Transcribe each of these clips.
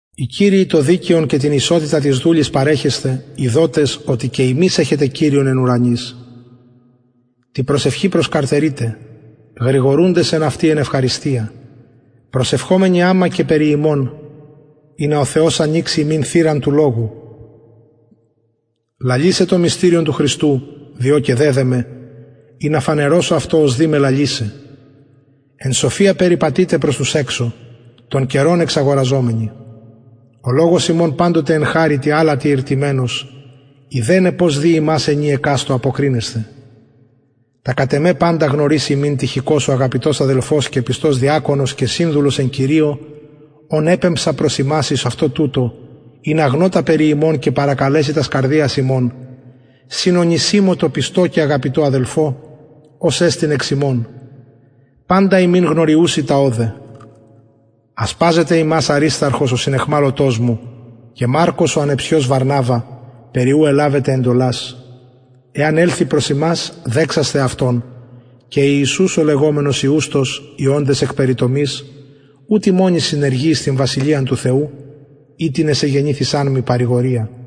οι κυριοι το δικαιον και την ισοτητα τοις δουλοις παρεχεσθε ειδοτες οτι και υμεις εχετε κυριον εν ουρανοις τη προσευχη προσκαρτερειτε γρηγορουντες εν αυτη εν ευχαριστια προσευχομενοι αμα και περι ημων ινα ο θεος ανοιξη ημιν θυραν του λογου λαλησαι το μυστηριον του χριστου δι ο και δεδεμαι ινα φανερωσω αυτο ως δει με λαλησαι εν σοφια περιπατειτε προς τους εξω τον καιρον εξαγοραζομενοι ο λογος υμων παντοτε εν χαριτι αλατι ηρτυμενος ειδεναι πως δει υμας ενι εκαστω αποκρινεσθαι τα κατ εμε παντα γνωρισει υμιν τυχικος ο αγαπητος αδελφος και πιστος διακονος και συνδουλος εν κυριω ον επεμψα προς υμας εις αυτο τουτο ινα γνω τα περι υμων και παρακαλεση τας καρδιας υμων συν ονησιμω τω πιστω και αγαπητω αδελφω ος εστιν εξ υμων παντα υμιν γνωριουσιν τα ωδε ασπαζεται υμας αρισταρχος ο συναιχμαλωτος μου και μαρκος ο ανεψιος βαρναβα περι ου ελαβετε εντολας εαν ελθη προς υμας δεξασθε αυτον και ιησους ο λεγομενος ιουστος οι οντες εκ περιτομης ουτοι μονοι συνεργοι εις την βασιλειαν του θεου οιτινες εγενηθησαν μοι παρηγορια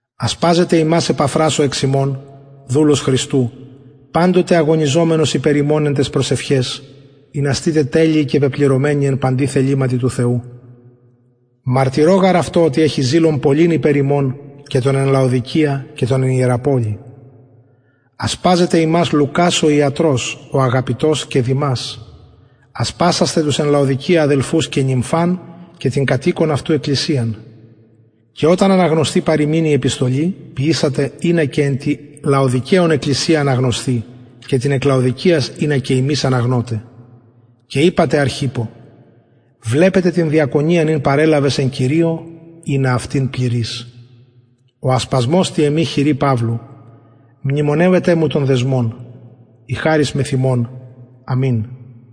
ασπαζεται υμας επαφρας ο εξ υμων δουλος χριστου παντοτε αγωνιζομενος υπερ υμων εν ταις προσευχαις ινα στητε τελειοι και πεπληρωμενοι εν παντι θεληματι του θεου μαρτυρω γαρ αυτω οτι εχει ζηλον πολυν υπερ υμων και των εν λαοδικεια και των εν ιεραπολει ασπαζεται υμας λουκας ο ιατρος ο αγαπητος και δημας ασπασασθε τους εν λαοδικεια αδελφους και νυμφαν και την κατ οικον αυτου εκκλησιαν και οταν αναγνωσθη παρ υμιν η επιστολη ποιησατε ινα και εν τη λαοδικαιων εκκλησια αναγνωσθη και την εκ λαοδικειας ινα και υμεις αναγνωτε και ειπατε αρχιππω βλεπε την διακονιαν ην παρελαβες εν κυριω ινα αυτην πληροις ο ασπασμος τη εμη χειρι παυλου μνημονευετε μου των δεσμων η χαρις μεθ υμων αμην